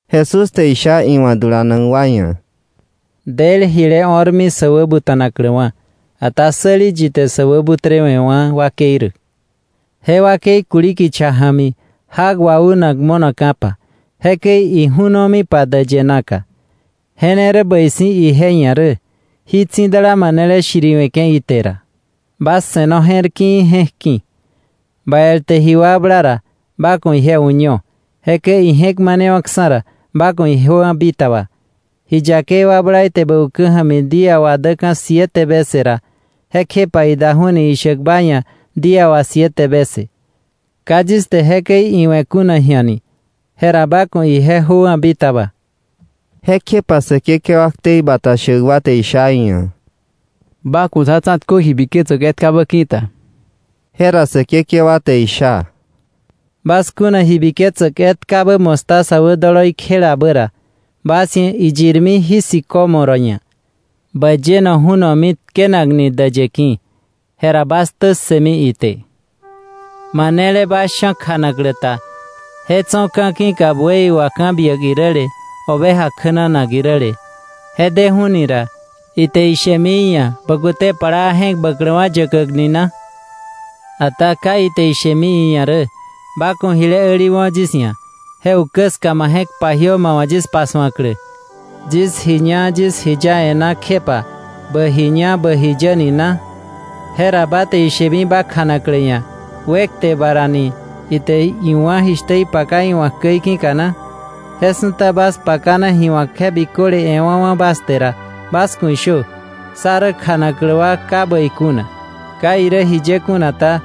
Jesús te isha iwa̱ dulanak wa ia̱: “Del jile o̱rmi sä wä buta̱nakläwa̱, ata ¡säli yi te sä wäbutrewe̱wa̱ wakei rä! Je wakei kuli kicha ja̱mi jak waunak mo̱naka̱pa jekäi iju̱nomipa däyë na ka. Je ne rä bäi si̱ ije ia̱ rä, jí tsi̱dala manele shiriwe̱ke̱ ite ra. Bas se̱no je̱r ki̱i̱ je̱k ki̱. “Ba el te ji wakbla ra, ba ku̱ ije uño; jekäi ije̱k manewa̱ksa̱ ra, ba ku̱ ijöwa̱ bitaba. Ji yakei wakbla ite bä ukä ja̱mi día wà däka̱ siete vece ra, jekjepa idaju̱ni ishäk ba ia̱ día wà siete vece: ‘Ka yis te jekäi iwe̱ kuna ji̱a ni,’ jera ba ku̱ ije jöwa̱ bitaba.” Jekjepa Säkekewa ktei bata shäk wa te isha iia̱: —Ba ku̱ sá tsa̱tkö ji biketsäk etkabä ki̱ta. Jera Säkekewa te isha: —Bas kuna ji biketsäk etkabä mostaza wä doloi kjelabä ra, bas ia̱ iyirmi jí sicómoro ia̱: ‘Bä yeno ju̱nomi tkenakni däyë ki̱’, jera bas ktä ssëmi ite. “Manele bas sha̱ kjanaklä ta, je tso̱ ka̱ ki̱ka buey wà ka̱ biäk iräle, oveja kjänanak iräle, je deju̱ni ra, ¿ite ishemi iia̱: ‘Bä kute plaa, je̱k bäkläkwa̱ yäkäk’ ni na? Ata ¿ka ite ishemi iia̱ rä: ‘Ba ku̱ jile äliwo̱ yis ia̱, je ukä ska ma je̱k pajiö ma wa̱ yis pasu̱aklä. Yis ji ña yis ji ya e̱ná kjepa bä ji ña bä ji yä’ ni na? Jera ¿ba te ishemi ba kjanaklä ia̱: ‘Wekte ba ra’ ni, ite iwá̱ jishtä ipakana iwa̱k käi ki̱ka na? Je su̱ta bas pakana ji wa̱k je biköle e̱wa̱wa̱ bas te ra, bas ku̱ ishö: ‘Sá rä kjanaklä wa ka bäi kuna. Ka irä jiye kuna ta,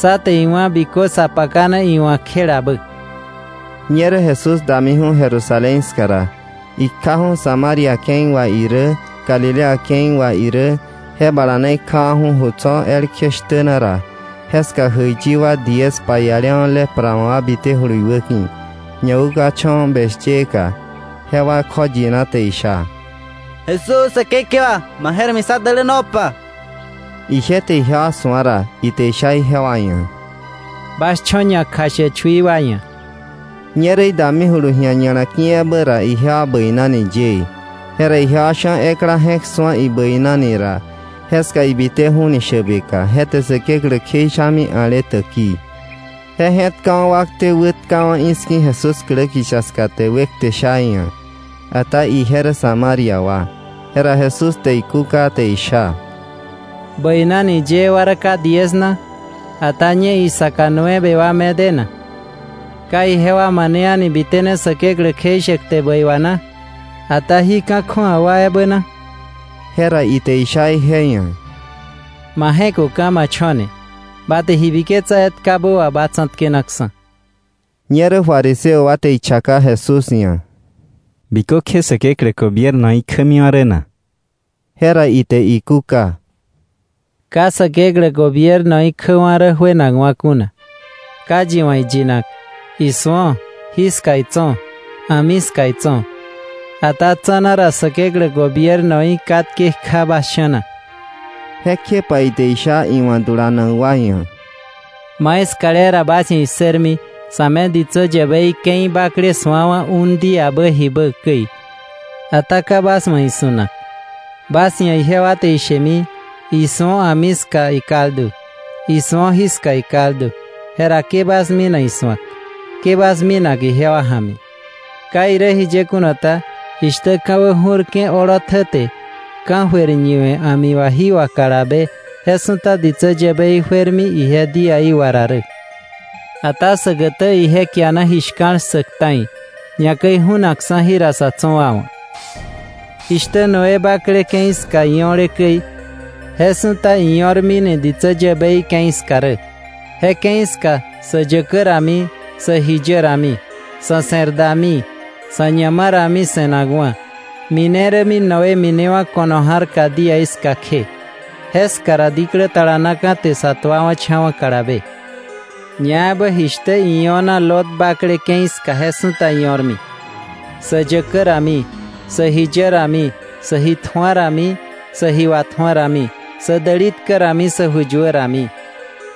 sá te iwá̱ bikö sa pakana iwa̱k kjelabä.’” Ñerä Jesús damiju̱ Jerusalén ska ra, ikjaju̱ Samaria ke̱i wà irä Galilea ke̱i wà irä, je bala na ikjawa̱ju̱ ju tso̱ elkje shtä na ra, jeska jäiyi wa diez paiale lepra wa̱ wa bitejulu iwäki̱, ñawäkukacha̱wa̱ beshyeka, jewa kjoyina te isha: —¡Jesús, Säkekewa, ma je̱r ja̱mi sá dälänopa! Ije te ijewa su̱a ra, ite isha ijewa ia̱: —Bas cho̱ ñakjashäk chui wa ia̱. Ñerä idamijulu ji̱a ña̱la ki̱ ebä ra, ijewa bäinani yëë. Jera ijewa sha̱ ekla je̱k su̱a ibäinani ra, jeska ibiteju̱teni shäbeka, je te Säkeklä kjeishami a̱le täkii. Je je̱tkawa̱ wakte wätkawa̱ i̱ski̱ Jesús klä kicha ska te wekte sha iia̱. Ata ije rä Samaria wa. Jera Jesús te ikúka te isha: —¿Bäinani yëë wa rä ka diez na? Ata ¿ñe isaka nueve wa me de na? ¿Ka ijewa mane a̱ni bitene Säkeklä kjeishäk kte bäi wà na? ¿Ata jí ka̱ kju̱awa wa ebä na? Jera ite isha ije ia̱: —Ma je̱köka̱, ma cho̱ ne. Ba te ji biketsa etkabä wà ba tsa̱tkenaksa̱. Ñerä fariseo wa te ichaka Jesús ia̱: —¿Bikökje Säkeklä gobiernoí kjämiwa̱ rä na? Jera ite ikúka: —Ka Säkeklä gobiernoí kjäkwa̱ rä juenakwa̱ kuna. Ka yi wa̱ iyinak: ‘¡Isu̱o! Jiska itso̱, a̱mi ska itso̱’; ata tsa̱na ra Säkeklä gobiernoí katke kja bas sha̱na. Jekjepa ite isha iwa̱ dulanak wa ia̱: —Maiskale ra bas ia̱ issërmi sa̱ me ditsä yäbei ke̱i bakle su̱awa̱ un díabä jibä käi, ata ka bas wa̱ isu̱nak. Bas ia̱ ijewa te ishemi: ‘¡Isu̱o, a̱mi ska ikaldu’! ‘¡Isu̱o, jiska ikaldu’! Jera ke bas mina isu̱ak, ke bas mina ijewa ja̱mi. Ka irä jiye kuna ta, jishtä ka̱wä ju̱rke̱ olotjä te ka̱jöir ñiwe̱ a̱mi wà jí wà kalabe, je su̱ta ditsä yäbei juermi ije díaí wà ra rä. Ata säkätä ije kiana ji shka̱l ssäk ta̱i, ñakäi ju̱naksa̱ jira sa̱ tso̱ wa wa̱. Jishtä Noé bakle ke̱i ska io̱le käi, je su̱ta io̱rmini ditsä yäbei je ke̱i ska rä. Je ke̱i ska sä yäkä rami, sä ji yä rami, sa̱ se̱r dami, sa̱ ñama rami se̱nakwa̱, mine rämi Noé minewa̱ ko̱no ja̱rka día ska kje. Jeska ra diklä talanaka̱ te sa tuawa̱cha̱wa̱ kalabe. Ñaebä jishtä io̱na Lot bakle ke̱i ska je su̱ta io̱rmi: Sä yäkä rami, sä ji yä rami, sä ji tju̱a rami, sä ji watju̱a rami, sä däli tkä rami, sä ju yuä rami.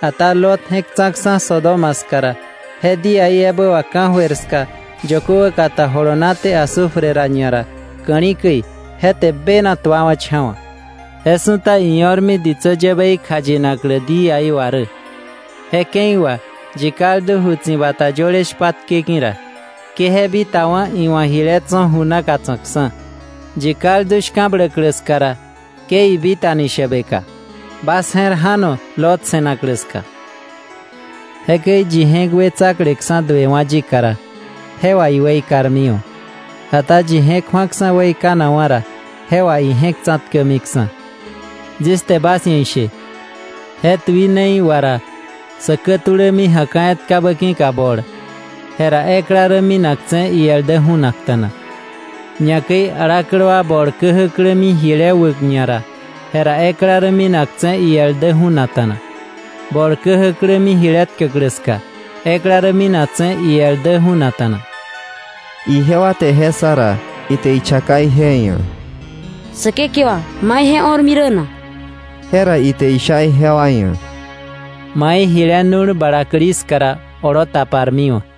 Ata Lot je̱k tsa̱ksa̱ Sodoma ska ra, je día ebä wà ka̱jöir ska yökö wäkata jolonaté azufre ra ñara ka̱li̱ käi, je te bena tuawa̱cha̱wa̱. Je su̱ta io̱rmi ditsä yäbei kjayinaklä díaí wà rä. “Je ke̱i wà yi kaldu ju tsi̱bata yöle shpatke ki̱ ra, ke je bitawa̱ni iwa̱ jile tso̱ ju na tsa̱kksa̱. Yi kaldu shka̱bläklä ska ra, ke ibitani shäbeka. Bas je̱r ja̱no Lot se̱naklä ska. Jekäi yi je̱k wetsakleksa̱ duewa̱ yika ra, je wà iweikarmiwa̱. Ata yi je̱k ju̱aksa̱ weikanakwa̱ ra, je wà ije̱k tsa̱tkämiksa̱. “Yis te bas ia̱ ishe; je tuinei wà ra sä kätulämi ja̱ka̱ etkabä ki̱ka bol, jera ekla rä minaktse̱, iel dä ju̱nakta̱na. Ñakäi alaklä wa bol käjäklämi jile wäk ñara, jera ekla rä minaktse̱, iel dä ju̱nakta̱na.” Bol käjäklämi jile tkäklä ska, ekla rä minaktse̱, iel dä ju̱nakta̱na. Ijewa te je ssa ra, ite ichaka ije ia̱: —Säkekewa, ¿mai je o̱rmi rä na? Jera ite isha ijewa ia̱: —Mai jile nu̱l balakli ska ra olo taparmiwa̱.